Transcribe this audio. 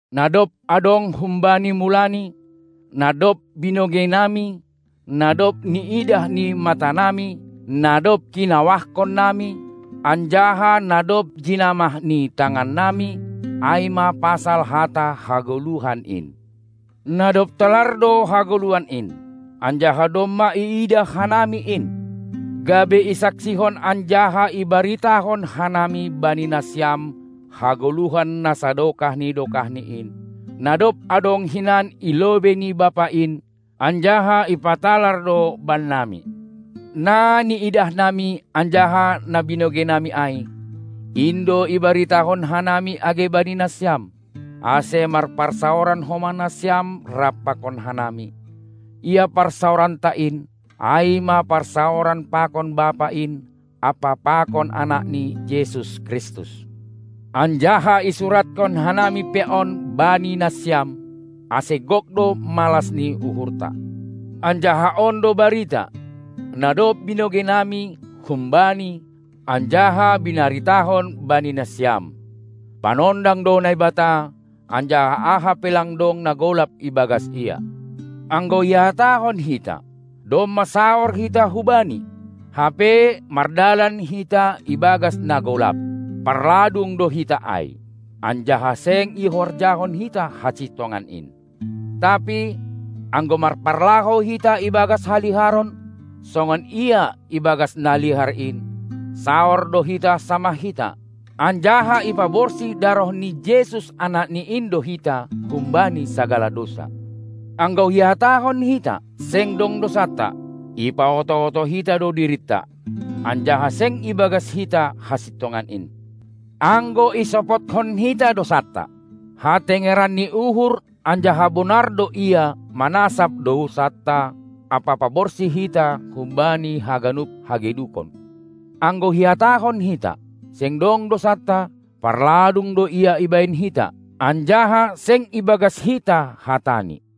Na dob adong humbani mulani, na dob binogeinami, na dob niidah ni matanami, na dob kinawahkonnami, anjaha na dob jinamah ni tangannami, ai ma pasal hata hagoluhan in. ( Na dob talar do hagoluhan in, anjaha domma iidah hanami in, gabe isaksihon anjaha ibaritahon hanami bani nasiam hagoluhan na sadokah ni dokahni in, na dob adong hinan i lobei ni Bapa in anjaha ipatalar do bannami.) Na niidahnami anjaha na binogeinami ai, in do ibaritahon hanami age bani nasiam, ase marparsaoran homa nasiam rap pakon hanami. Ia parsaoranta in, ai ma parsaoran pakon Bapa in ampa pakon Anakni Jesus Kristus. Anjaha isurathon hanami pe on bani nasiam, ase gok do malas ni uhurta. Anjaha on do barita, na dob binogeinami hum-Bani anjaha binaritahon bani nasiam: Panondang do Naibata, anjaha aha pe lang dong na golap ibagas Ia. Anggo ihatahon hita, domma saor hita hu Bani, hape mardalan hita ibagas na golap, parladung do hita ai, anjaha seng ihorjahon hita hasintongan in. Tapi, anggo marparlahou hita ibagas haliharon, songon Ia ibagas na lihar in, saor do hita samah hita, anjaha ipaborsih daroh ni Jesus, Anakni in do hita humbani sagala dousa. Anggo ihatahon hita, seng dong dousanta, ipaoto-oto hita do dirinta, anjaha seng ibagas hita hasintongan in. Anggo isopothon hita dousanta, hatengeran ni uhur anjaha bonar do Ia manasap dousanta ampa paborsih hita humbani haganup hagedukon. Anggo ihatahon hita, seng dong dousanta, parladung do Ia ibahen hita, anjaha seng ibagas hita hataNi.